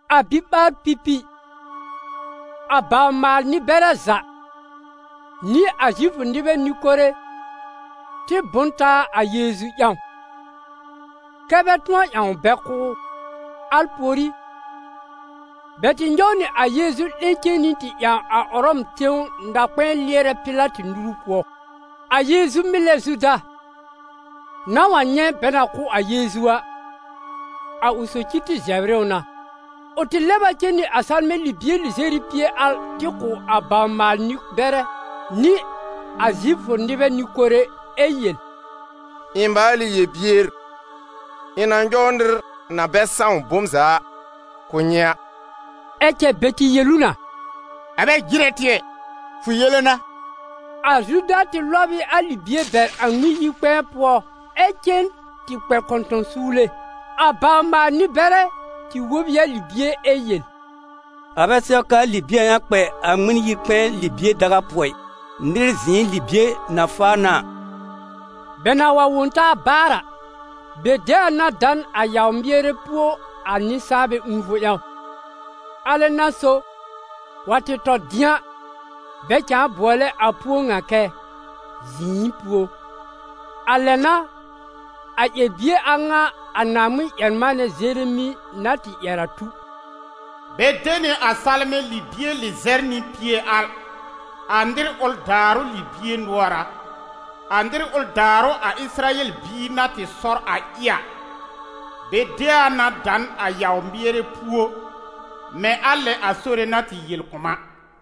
A biɓaar-pipi, a bawr-maal-nɩ-bɛrɛ za nɩ a Zifʋ nɩbɛ nɩ-kore tɩ bʋ n taa a Yeezu ƴãw, kɛ́ bɛ tʋ̃ɔ ƴãw bɛ kʋ́ ʋ. Al pùorí, bɛ tɩ nyɔw nɩ a Yeezu 'lẽ cen nɩ tɩ ƴãw a Ʋrɔm tẽw na-kpɛ̃ɛ lɩɛrɛ Pɩlatɩ nuru pʋɔ. A Yeezu mɩlɛ Zuda, na wa nyɛ̃ bɛ na kʋ́ a Yeezu a, a ʋ socir tɩ zɛbr ɩ ʋ na. Ʋ tɩ lɛb a cen nɩ a salmɛ̃ libie lɩzɛr nɩ pie al tɩ kʋ̀ a bawr-maal-nɩ-bɛrɛ nɩ a Zifʋ nɩbɛ nɩ-kore, ɛ yel: «Ɩ̃ maal ɩ yel-bier, ɩ̃ na nyɔw nɩr na bɛ sãw bom za a, kʋ̀ nyɩ a.» Ɛ cɛ bɛ tɩ yel ʋ na: «A bɛ jɩrɛ tɩ ɛ! Fʋ yele n'a!» A Zuda tɩ lɔb ɩ a libie bɛr a Ŋmɩn-yi-kpɛ̃ɛ pʋɔ ɩ cen tɩ kpɛ kɔ̃tɔ̃-suwle. A bawr-maal-nɩ-bɛrɛ tɩ wob ɩ a libie ɛ yel: «A bɛ sɛw k'aa libie a ŋa kpɛ a Ŋmɩn-yi-kpɛ̃ɛ libie daga pʋɔ ɩ, nɩr zɩ̃ɩ libie na faa n'a a.» Bɛ na wa wõ taa baar a, bɛ de a na da n a yaw-mɩɛrɛ púo a nɩ-sãanbɛ ũufʋ ƴãw. Alɛ n'a so, wa tɩ tɔ dɩ̃a, bɛ cãa bʋɔlɛ a púo ŋa kɛ: «Zɩ̃ɩ-púo.» A lɛ n'a, a ƴɛr-bie a ŋa a Naaŋmɩn-ƴɛr-manɛ Zeremi na tɩ ƴɛr a tu: «Bɛ de nɩ a salmɛ̃ libie lɩzɛr nɩ pie al, a nɩr ʋl daarʋ libie nʋɔr a, a nɩr ʋl daarʋ a Ɩsɩrayɛl biir na tɩ sɔr a ɩ a. Bɛ de a na da n a yaw-mɩɛrɛ púo, mɛ̃ a lɛ a Sore na tɩ yel kʋ̀ m a.»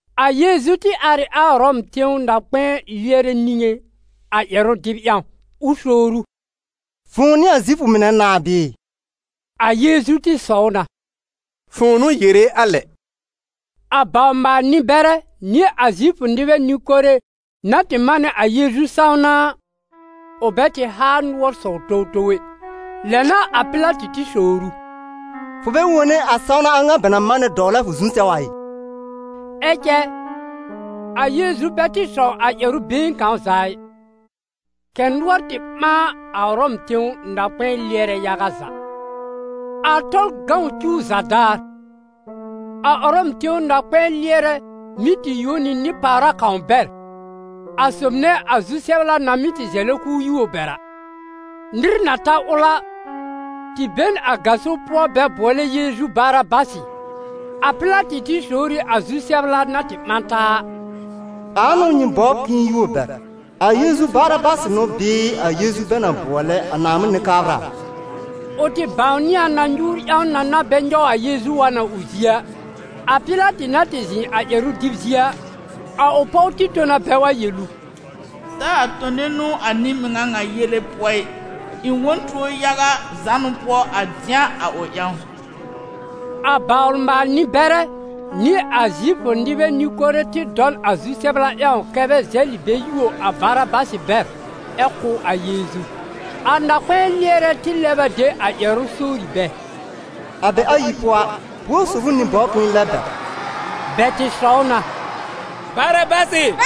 A Yeezu tɩ ar ɩ a Ʋrɔm tẽw na-kpɛ̃ɛ lɩɛrɛ niŋé a ƴɛrʋ dɩb ƴãw, ʋ sowr ʋ: «Fʋ̃ʋ n'ɩ a Zifʋ mɩnɛ nãà bɩɩ?» A Yeezu tɩ sɔw na: «Fʋ̃ʋ n'ʋ yere a lɛ!» A bawr-maal-nɩ-bɛrɛ nɩ a Zifʋ nɩbɛ nɩ-kore na tɩ manɛ a Yeezu sãwna a, ʋ bɛ tɩ haa nʋɔr sɔw towtow ɛ. Lɛ n'a a Pɩlatɩ tɩ sowr ʋ: «Fʋ bɛ wone a sãwna a ŋa bɛ na manɛ dɔwlɛ a fʋ zu sɛw a ɩ?» Ɛ cɛ a Yeezu bɛ tɩ sɔw a ƴɛrʋ been kãw za ɩ, kɛ̀ nʋɔr tɩ ɓãa a Ʋrɔm tẽw na-kpɛ̃ɛ lɩɛrɛ yaga za. A Tɔlʋ cuw za daar, a Ʋrɔm tẽw na-kpɛ̃ɛ lɩɛrɛ mɩ́ tɩ yuo nɩ nɩ-pàwra kãw bɛr, a sob nɛ a zu-sɛbla na mɩ́ zɛlɩ k'ʋʋ yuo bɛr a. Nɩr na ta ʋl a, tɩ be n a gaso pʋɔ bɛ bʋɔlɛ Yeezu Barabasɩ. A Pɩlatɩ tɩ sowr ɩ a zu-sɛbla na tɩ ɓã taa a: «Ãa n'ʋ nyɩ bɔbr k'ɩ̃ɩ yuo bɛr: a Yeezu Barabasɩ n'ʋ bɩɩ a Yeezu bɛ na bʋɔlɛ a Naaŋmɩn Nɩ-kabra a?» Ʋ tɩ bãwnɩ a na nyuur ƴãw na n'a bɛ nyɔw a Yeezu wa n a ʋ zie a. A Pɩlatɩ na tɩ zɩ̃ a ƴɛrʋ dɩb zie a, a ʋ pɔw tɩ tõ na bɛ tɩ yel ʋ: «Taa tone nũu a nɩ-mɩŋa ŋa yele pʋɔ ɩ. Ɩ̃ wõ n tuo yaga zánʋ pʋɔ a dɩ̃a a ʋ ƴãw.» A bawr-maal-nɩ-bɛrɛ nɩ a Zifʋ nɩbɛ nɩ-kore tɩ dɔ n a zu-sɛbla ƴãw kɛ́ bɛ zɛlɩ bɛ yuo a Barabasɩ bɛr ɛ kʋ́ a Yeezu. A na-kpɛ̃ɛ lɩɛrɛ tɩ lɛb a de a ƴɛrʋ sowri bɛ: «A bɛ ayi pʋɔ a, buor sob ʋ nyɩ bɔbr k'ɩ̃ɩ lɛb bɛr?» Bɛ tɩ sɔw na: «Barabasɩ!»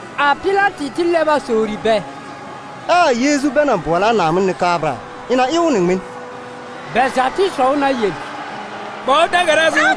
A Pɩlatɩ tɩ lɛb a sowri bɛ: «Ɛ a Yeezu bɛ na bʋɔlɛ Naaŋmɩn Nɩ-kabra a, ɩ̃ na ɩ ʋ nɩ ŋmɩn?» Bɛ za tɩ sɔw na yel: «Kpa ʋ da-gara zu!»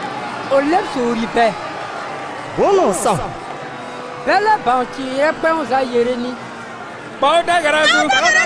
Ʋ lɛb sowri bɛ: «Bʋ̃ʋ n'ʋ ʋ sãw?» Bɛ lɛb bãw cɩɩrɛ kpɛ̃w za yere nɩ: «Kpa ʋ da-gara zu!»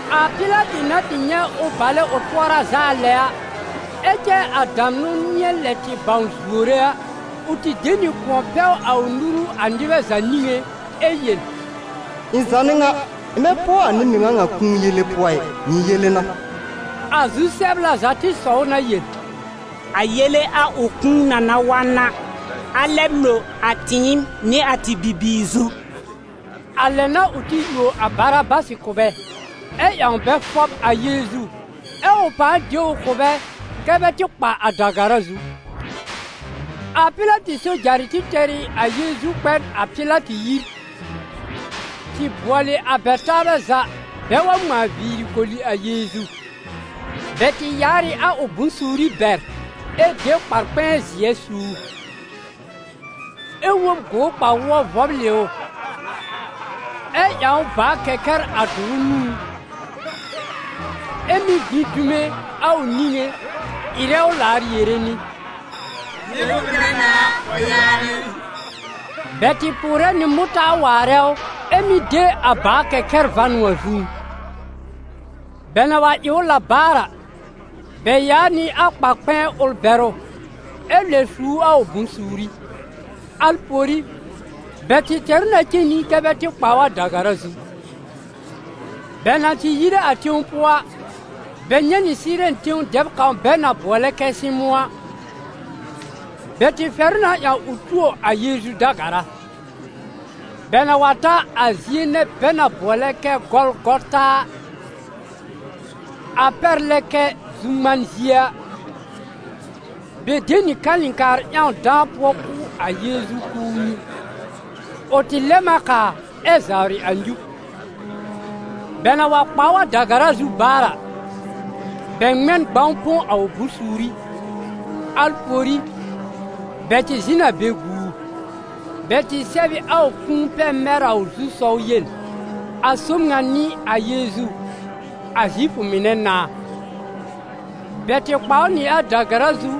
A Pɩlatɩ na tɩ nyɛ̃ ʋ balɛ ʋ tʋɔra zaa lɛ a, ɛ cɛ a damnʋ nɩ̃ɛ lɛ tɩ bãw zuore a, ʋ tɩ de nɩ kʋ̃ɔ pɛw a ʋ nuru a nɩbɛ za niŋé ɛ yel: «Ɩ̃ za n'ɩ ŋa, ɩ̃ bɛ pʋɔ a nɩ-mɩŋa ŋa kũu yele pʋɔ ɩ. Nyɩ yele n'a.» A zu-sɛbla za tɩ sɔw na yel: «A yele a ʋ kũu na na wa n a, a lɛb lo a tɩɩm nɩ a tɩ bibiir zu!» A lɛ n'a ʋ tɩ yuo a Barabasɩ kʋ̀ bɛ ɛ ƴãw bɛ fɔb a Yeezu, ɛ ʋ pãa de ʋ kʋ̀ bɛ kɛ́ bɛ tɩ kpa a da-gara zu. A Pɩlatɩ sojarɩ tɩ tɛr ɩ a Yeezu kpɛ n a Pɩlatɩ yir, tɩ bʋɔlɩ a bɛ taabɛ za bɛ wa ŋmãa viiri koli a Yeezu. Bɛ tɩ yaar ɩ a ʋ bʋ̃-suuri bɛr ɛ de kpar-kpɛ̃ɛ zɩ̃ɛ su ʋ; ɛ wob gʋʋr kpa-wʋɔ vɔblɩ ʋ, ɛ ƴãw ʋ bàa-kɛkɛra dʋrʋ nũú, ɛ mɩ́ gbĩ dume a ʋ niŋé ɩrɛ ʋ laar yere nɩ: «Zifʋ mɩnɛ nãà a, fʋ yaanɩ!» Bɛ tɩ pʋʋrɛ nɩ mʋtaar waarɛ ʋ, ɛ mɩ́ de a bàa-kɛkɛr va n a ʋ zũú. Bɛ na wa ɩ ʋ la baar a, bɛ yaa nɩ a kpar-kpɛ̃ɛ ʋl bɛr ʋ, ɛ lɛb su ʋ a ʋ bʋ̃-suuri. Al pùorí, bɛ tɩ tɛr ʋ na cen nɩ kɛ́ bɛ tɩ kpa ʋ a da-gara zu. Bɛ na tɩ yire a tẽw pʋɔ a, bɛ nyɛ̃ Sɩɩrɛn tẽw dɛb kãw bɛ na bʋɔlɛ kɛ Sɩmʋ̃ a, bɛ tɩ fɛr ʋ na ƴãw ʋ tuo a Yeezu da-gara. Bɛ na wa ta a zie nɛ bɛ na bʋɔlɛ kɛ Gɔlgɔta a, a pɛr lɛ kɛ Zu-ŋman zie a, bɛ de nɩ kalɩ̃kaar ƴãw dãa pʋɔ kʋ̀ a Yeezu k'ʋʋ nyũ. Ʋ tɩ lɛm a kaa ɛ zawrɩ a nyub. Bɛ na wa kpa ʋ a da-gara zu baar a, bɛ ŋmɛ n gbãw põ a ʋ bʋ̃-suuri. Al pùorí, bɛ tɩ zɩ̃ n a be gu ʋ. Bɛ tɩ sɛb ɩ a ʋ kũu pɛr mɛr a ʋ zu-sɔw yel: «A sob ŋa n'ɩ a Yeezu, a Zifʋ mɩnɛ nãà.» Bɛ tɩ kpa ʋ nɩ a da-gara zu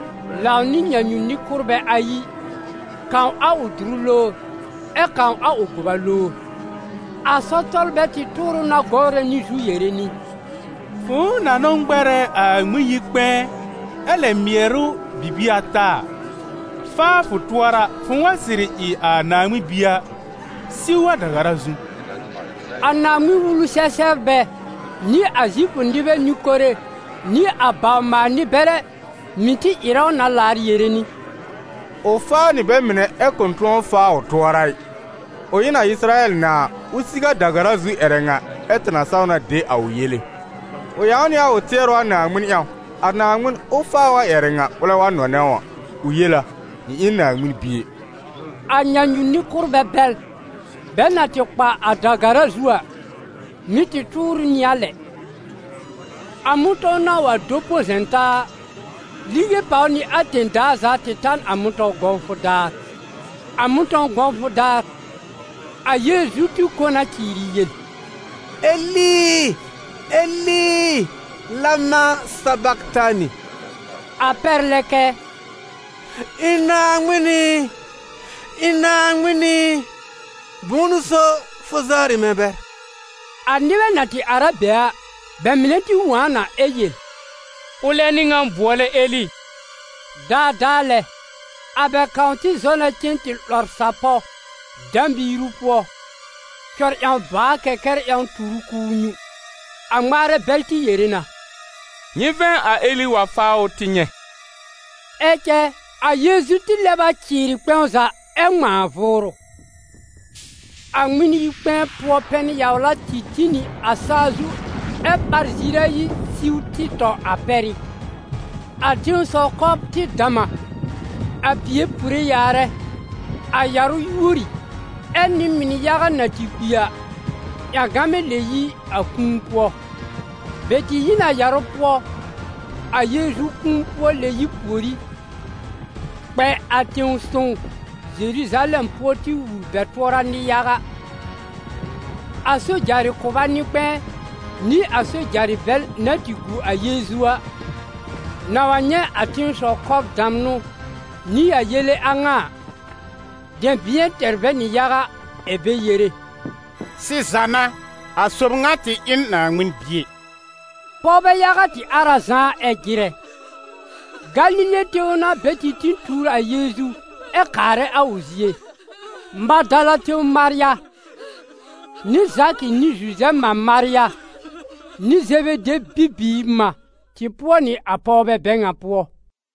lãw nɩ nyãnyu-nɩ-kʋ́rbɛ ayi, kãw a ʋ dʋrʋ lowr, ɛ kãw a ʋ gʋba lowr. A sɔr-tɔlbɛ tɩ tʋʋr ʋ na gɔwrɛ nɩ zu, yere nɩ: «Fʋ̃ʋ na n'ʋ ŋmɛrɛ a Ŋmɩn-yi-kpɛ̃ɛ ɛ lɛb mɩɛr ʋ bibie ata a, faa fʋ tʋɔra fʋ̃ʋ wa sɩrɩ ɩ a Naaŋmɩn Bie a, siw a da-gara zu!» A Naaŋmɩn-Wulu-sɛ-sɛbrbɛ nɩ a Zifʋ nɩbɛ nɩ-kore nɩ a bawr-maal-nɩ-bɛrɛ mɩ̀ tɩ ɩrɛ ʋ na laar yere nɩ: «Ʋ faa nɩ bɛ mɩnɛ ɛ kʋ̃ tʋ̃ɔ faa ʋ tʋɔra ɩ! Ʋ ɩ n a Ɩsɩrayɛl nãà, ʋ siw a da-gara zu ƴɛrɛ ŋa, ɛ tɩ na saw na de a ʋ yele! Ʋ ƴãw nɩ a ʋ tɩɛrʋ a Naaŋmɩn ƴãw, a Naaŋmɩn ʋ faa ʋ a ƴɛrɛ ŋa, ʋlɛ wa nɔnɛ ʋ a. Ʋ yel a: ‹Ɩ̃ ɩ n Naaŋmɩn Bie!›» A nyãnyu-nɩ-kʋ́rbɛ bɛl, bɛ na tɩ kpa a da-gara zu a, mɩ̀ tɩ tʋʋr ʋ nɩ a lɛ. A mʋ̃tɔ̃w na wa do põ zɛ̃ taa a, lige pàw nɩ a tẽ-daa za tɩ ta n a mʋ̃tɔ̃w gɔ̃wfʋ daar. A mʋ̃tɔ̃w gɔ̃wfʋ daar, a Yeezu tɩ kõ na cɩɩrɩ yel: «Eli, Eli, lema sabaktani», a pɛr lɛ kɛ: «Ɩ̃ Naaŋmɩn ɩ, ɩ̃ Naaŋmɩn ɩ, bʋ̃ʋ n'ʋ so fʋ zawrɩ mɛ̃ bɛr?» A nɩbɛ na tɩ ar a be a, bɛ mɩnɛ ti wõ a na ɛ yel: «Ʋlɛ n'ɩ ŋan bʋɔlɛ Eli.» Daadaa lɛ, a bɛ kãw tɩ zɔ na cen tɩ 'lɔr sapɔ̃ dã-miiru pʋɔ, cɔr ƴãw bàa-kɛkɛr ƴãw tur ʋ k'ʋʋ nyũ. A ŋmaarɛ bɛl tɩ yere na: «Nyɩ vɛ̃ a Eli wa faa ʋ tɩ nyɛ̃!» Ɛ cɛ a Yeezu tɩ lɛb a cɩɩrɩ kpɛ̃w za, ɛ ŋmãa vʋʋrʋ. A Ŋmɩn-yi-kpɛ̃ɛ pʋɔ pɛn-yawlatɩ tĩ nɩ a saa zu ɛ ɓar ziir ayi siw tɩ tɔ a pɛrɩ́. A tẽsɔw kɔbr tɩ dam a, a pìe pure yaarɛ, a yarʋ yuori, ɛ nɩ-mɩn yaga na tɩ kpi a, ƴãgamɛ lɛb yi a kũu pʋɔ. Bɛ tɩ yi n a yarʋ pʋɔ, a Yeezu kũu-pʋɔ-lɛ-yib pùorí, kpɛ a tẽ-sõw Zeruzalɛm pʋɔ tɩ wul bɛ tʋɔra nɩ-yaga. A sojarɩ kʋba nɩ-kpɛ̃ɛ nɩ a sojarɩ bɛl na tɩ gu a Yeezu a, na wa nyɛ̃ a tẽsɔw kɔbr damnʋ nɩ a yele a ŋa a, dɛ̃bɩ̃ɛ tɛr bɛ nɩ yaga ɛ̀ bɛ yere: «Sɩza n'a, a sob ŋa tɩ ɩ n Naaŋmɩn Bie.» Pɔwbɛ yaga tɩ ar a zãá ɛ jɩrɛ: Galile tẽw n'a bɛ tɩ tĩ tuur a Yeezu ɛ kaarɛ a ʋ zie. Madala tẽw Marya, nɩ Zakɩ nɩ Zuzɛb mã Marya, nɩ Zebede bibiir mã tɩ pʋɔ nɩ a pɔwbɛ bɛ ŋa pʋɔ.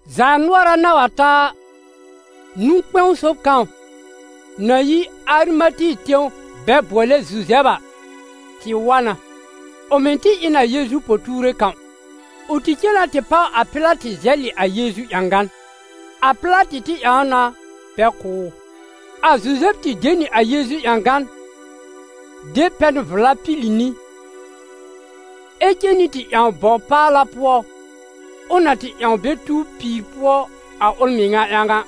Zaanʋɔra na wa ta a, nũ-kpɛ̃w sob kãw, na yi Arimate tẽw bɛ bʋɔlɛ Zuzɛb a, tɩ wa na. Ʋ mɩ̀ tɩ ɩ n a Yeezu po-tuure kãw. Ʋ tɩ cen na tɩ páw a Pɩlatɩ zɛlɩ a Yeezu ƴãgan. A Pɩlatɩ tɩ ƴãw na bɛ kʋ̀ ʋ. A Zuzɛb tɩ de nɩ a Yeezu ƴãgan, de pɛn vla pili nɩ, ɛ cen nɩ tɩ ƴãw bɔw paala pʋɔ ʋ na tɩ ƴãw bɛ tuw pìir pʋɔ a ʋl mɩŋa ƴãw a,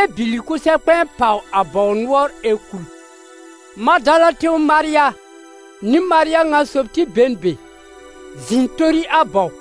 ɛ bìlì kʋsɛ-kpɛ̃ɛ pàw a bɔw nʋɔr ɛ kul. Madala tẽw Marya nɩ Marya ŋa sob tɩ be n be, zɩ̃ tori a bɔw.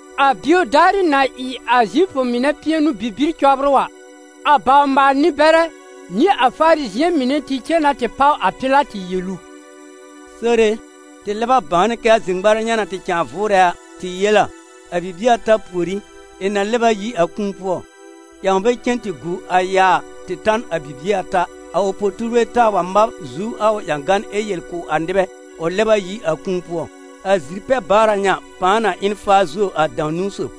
A bio daarɩ na ɩ a Zifʋ mɩnɛ pɩɛnʋ-bibir cɔbrʋ a, a bawr-maal-nɩ-bɛrɛ nɩ a Farizɩ̃ɛ mɩnɛ tɩ cen na tɩ páw a Pɩlatɩ yel ʋ: «Sore e, tɩ lɛb a bãwnɩ kɛ́ a zir-ŋmarɛ ŋa na tɩ cãa vʋʋrɛ a, tɩ yel a: ‹A bibie ata pùorí, ɩ̃ na lɛb ayi a kũu pʋɔ.› Ƴãw bɛ cen tɩ gu a yaa tɩ ta n a bibie ata, a ʋ po-tuurbɛ taa wa mab zu a ʋ ƴãgan ɛ yel kʋ̀ a nɩbɛ: ‹Ʋ lɛb a yi a kũu pʋɔ.› A zir-pɛ-baara ŋa pãa na ɩ n faa zuo a dãw-niwn sob.»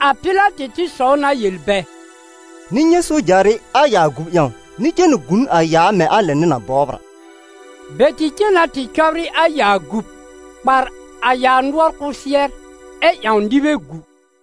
A Pɩlatɩ tɩ sɔw na yel bɛ: «Nyɩ nyɛ̃ sojarɩ a yaa gub ƴãw, nyɩ cen tɩ gu n a yaa mɛ̃ a lɛ nyɩ na bɔbr a.» Bɛ tɩ cen na tɩ cɔbrɩ a yaa gub, kpàr a yaa nʋɔr kʋsɩɛr ɛ ƴãw nɩbɛ gu.